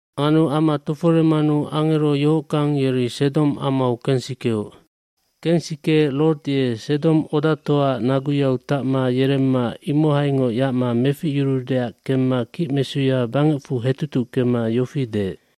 aAnu ama toforemanu angero yohockang yeri Sedom amau kensikeoc. Kensikeec Lot ye Sedom odatoaac naguyau tacma yeremma imohaingoc yacma meficyuruudeac kemma kicmesuya bangecfu hetutuckema yofi deec,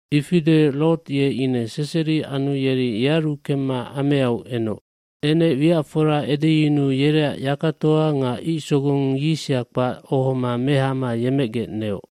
Ifi deec Lot ye ine seseri anu yeri yearu kemma ameau enoc. Enec wiacfora edeyunuu yereac yakatoa nga icsogong yisa kpac ohoma mehama yemecgec neoc.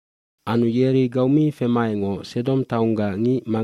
Anu yeri gau mi femaecngoc Sedom taonggac ngic,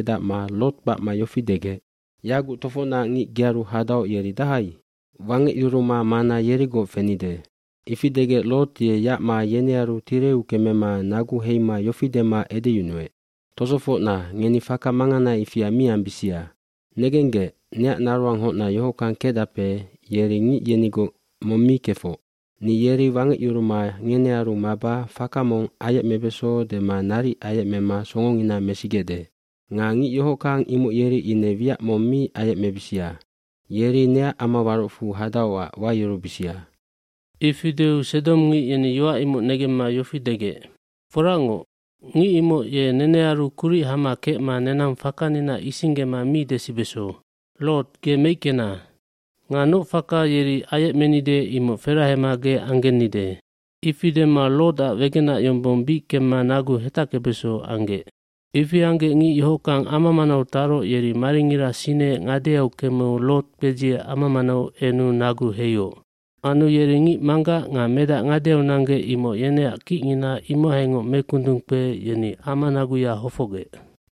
cLot kpacma yofi degec, “Yaguc tofocnac ngic gearu hadaoc yeri dahai? Wangecyuruma mana yerigoc fenide.” Ifi degec Lot ye yacma yenearu tireu kemema nagu heima yofi dema edeyunuec, “Tosofocna, ngeni faka mangana ifia mi ambisia. Negenggec, neac naroanghocna yohockang kecdape yeri ngic yenigoc mong mi kefoc. Ni yeri wangecyuruma ngenearu maba faka mong ayecmebeso dema naric ayecmema songongina mesigecde. Nga ngic yohockang imoc yeri ine wiac mong mi ayecmebisia. Yeri neac amawarocfu hadaocac wayurubisia.” dIfi deu sedomngic yeni yoac imoc negemma yofi degec, “Foracngoc, ngic imoc ye nenearu kuric hama kecma nenang fakanina isinggema mi desibeso. Lot, ge meickena. Nga noc faka yeri ayecmenide imoc ferahema ge anggennide.” Ifi dema Lotac wegenac yombong bic kemma nagu hetackebeso anggec. Ifi anggec ngic yohockang ama manau taroc yeri maringira sineec ngadeau kemeu Lot kpedziec ama manau enu nagu heioc. eAnu yeri ngic manggac nga medac ngadeau nanggec imoc yeneac kicngina imohaingoc mekundungkpeec yeni ama naguya hofocgec.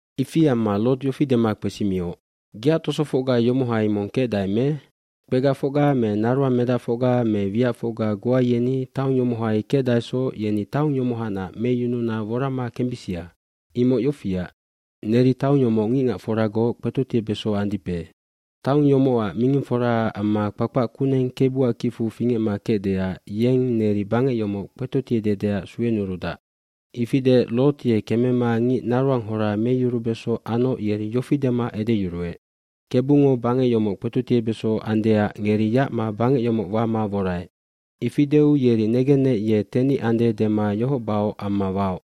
Ifi amma Lot yofi dema kpesimioc, “Geac tosofocga yomohai mong kecdae me? Kpegafocga me naroang medacfocga me wiacfocga goa yeni taong yomohai kecdaesoc yeni taong yomohanac meyununa worama kembisia. fImoc yofiac, neri taong yomoc ngicngacforagoc kpetotiebeso andipe. Taong yomocac mingingforaac amma kpakpac kuneng Kebuac kifu fingecma kecdeac yeng neri bangec yomoc kpetotiededeac suenurudac.” Ifi deec, Lot ye kemema ngic naroanghora meyurubeso anoc yeri yofi dema edeyuruec, “Kebungo bangec yomoc kpetotiebeso andeac ngeri yacma bangec yomoc wama woraec.” Ifi deu yeri negenec ye tenic ande dema ioc baoc amma waoc.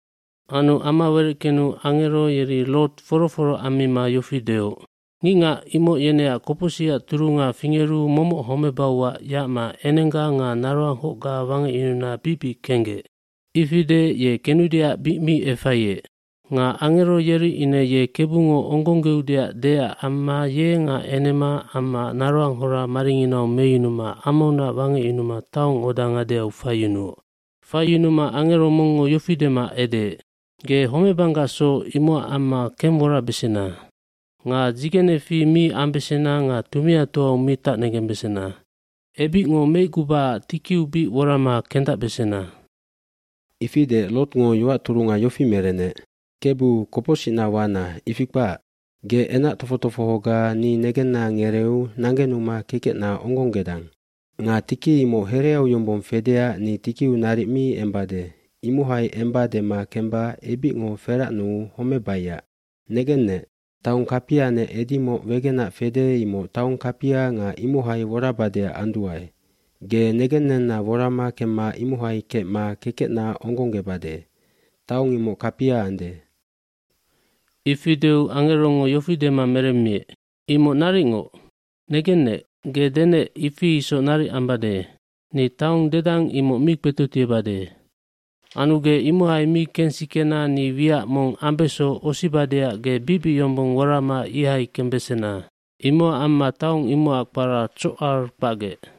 gAnu ama wereckenu angero yeri Lot foro foro ammima yofi deoc, “Ngicngac imoc yeneac kopocsicac turunga fingeru momoc homebauac yacma enengga nga naroanghocga wangecyununa bic bic kenggec.” hIfi deec ye kenudeac bic mi efaiec. Nga angero yeri ine ye Kebungo onggonggeudeac deecac amma ye nga enema amma naroanghora maringinau meyunuma amaunac wangecyunuma taong oda ngadeau faiyunuoc. Faiyunuma angero mongngo yofi dema edeec, “Ge homebanggacsoc imocac amma kengworabesena. Nga dzigenefi mi ambesena nga tumiatoau mi tacnegembesena. Ebicngo meicgubacac tikiu bic worama kendacbesena.” Ifi deec Lotngo yoac turunga yofi merenec, “Kebu, kopocsicna wana, ifi kpac. Ge enac tofoc tofohoga ni negenna negereeu nanggenuma kekecna onggongedang. Nga tiki imoc hereau yombong fedeac ni tikiu naric mi embade, imohai emba dema kemba ebicngo feracnuu homebaiac. Negennec, taong kapianec edimoc wegenac fede imoc taong kapia nga imohai worabadeac anduae. Ge negennenna worama kemma imohai kecma kekecna onggonggebade. Taong imoc kapia ande.” Ifi deu angerongo yofi dema meremmiec, “Imoc naricngoc, negennec, ge denec ifi isoc naric ambade. Ni taong dedang imoc mi kpetotiebade. jAnu ge imohai mi kengsikena ni wiac mong ambeso osibadeac ge bicbic yombong worama ihai kembesena.” Imocac amma taong imocac kpara Tsocari kpacgec.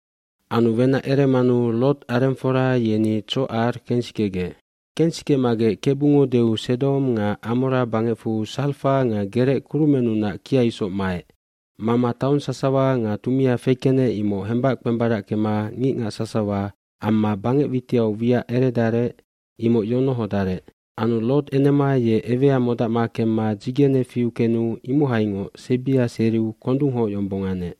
Anu wenac eremanu Lot arengfora yeni Tsocar kensikegec. lKensikemagec Kebungo deu Sedom nga Amora bangecfu sarfak nga gerec kurumennunac kia isoc maec. Mama taong sasawa nga tumia fekenec imoc hembac kpembarackema ngicngac sasawa amma bangec witiau wiac eredarec imoc yonohodarec. mAnu Lot enema ye ewea modacma kemma dzigene fiu kenu imohaingoc sebia seriu kondunghoc yombong anec.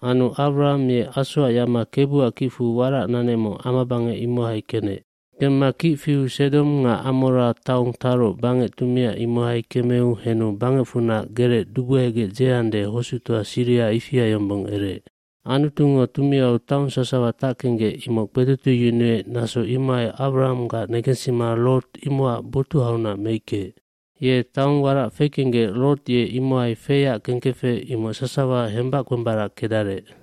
Anu Awraham ye asoac yacma Kebuac kicfu warac nanecmoc amabangec imohai kenec. Kemma kic fiu Sedom nga Amora taong taroc bangec tumia imohai kemeu henu bangecfunac gerec dubuhegec dzeande hosuctoa siriha ifia yombong ereec. nAnutungo tumiau taong sasawa tackenggec imoc kpetotieyunuec naso imohai Awrahamgac negensima Lot imocac botuhaunac meickeec. Ye taong warac fekenggec Lot ye imohai feyac kengkefec imoc sasawa hembac kpembarackedarec.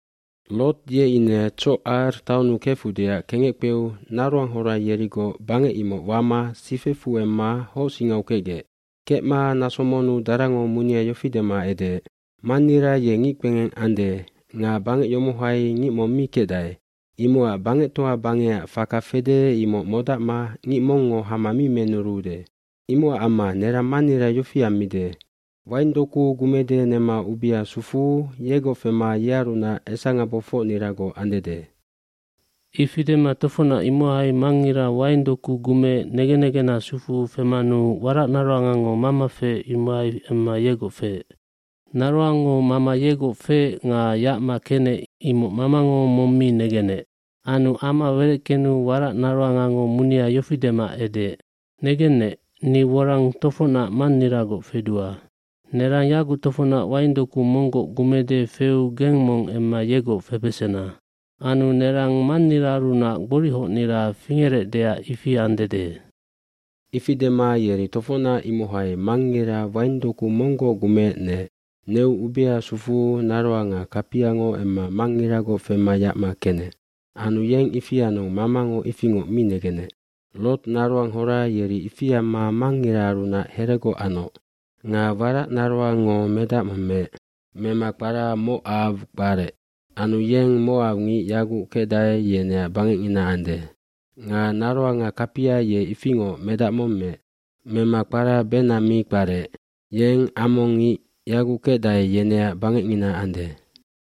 Lot ye ine Tsocar taonnu kefudeac kengec kpeu naroanghora yerigoc bangec imoc wama sifecfu emma hocsingau kecgec. Kecma naso monnu darango munia yofi dema edeec, “Mannira ye ngickpengeng ande nga bangec yomohai ngic mong mi kecdae. Imocac bangectoa bangecac faka fede imoc modacma ngic mongngo hama mi menuruude. oImocac amma nerang mannira yofi ammide, waing doku gumede nema ubia sufuu yegoc fema yearunac esangabofocniragoc andede.” Ifi dema tofocnac imohai mangngira waing doku gumeec negen negena sufuu femanu waracnaroangango mama feec imohai emma yegoc feec. Naroango mama yegoc feec nga yacma kenec imoc mamango mong mi negenec. Anu ama wereckenu warac naroangango munia yofi dema edeec, “Negennec, ni worang tofocnac manniragoc fedua. Nerang yaguc tofocnac waing doku monggoc gumede feu geng mong emma yegoc febesena. Anu nerang manniraarunac gborichocnira fingerecdeac ifi andede.” Ifi dema yeri tofocnac imohai mangngira waing doku monggoc gumeec neec. Neu ubea sufuu naroanga kapiango emma mangngiragoc fema yacma kenec. Anu yeng ifi anu mamango ifingoc mi negenec. Lot naroanghora yeri ifi amma mangngiraarunac heregoc anoc. Nga waracnaroango medac mong meec. Mema kpara Mocaw kparec. Anu yeng mocawngic yaguc kecdae yeneac bangecngina ande. Nga naroanga kapia ye ifingoc medac mong meec. Mema kpara Ben Ammi kparec yeng ammongngic yaguc kecdae yeneac bangecngina ande.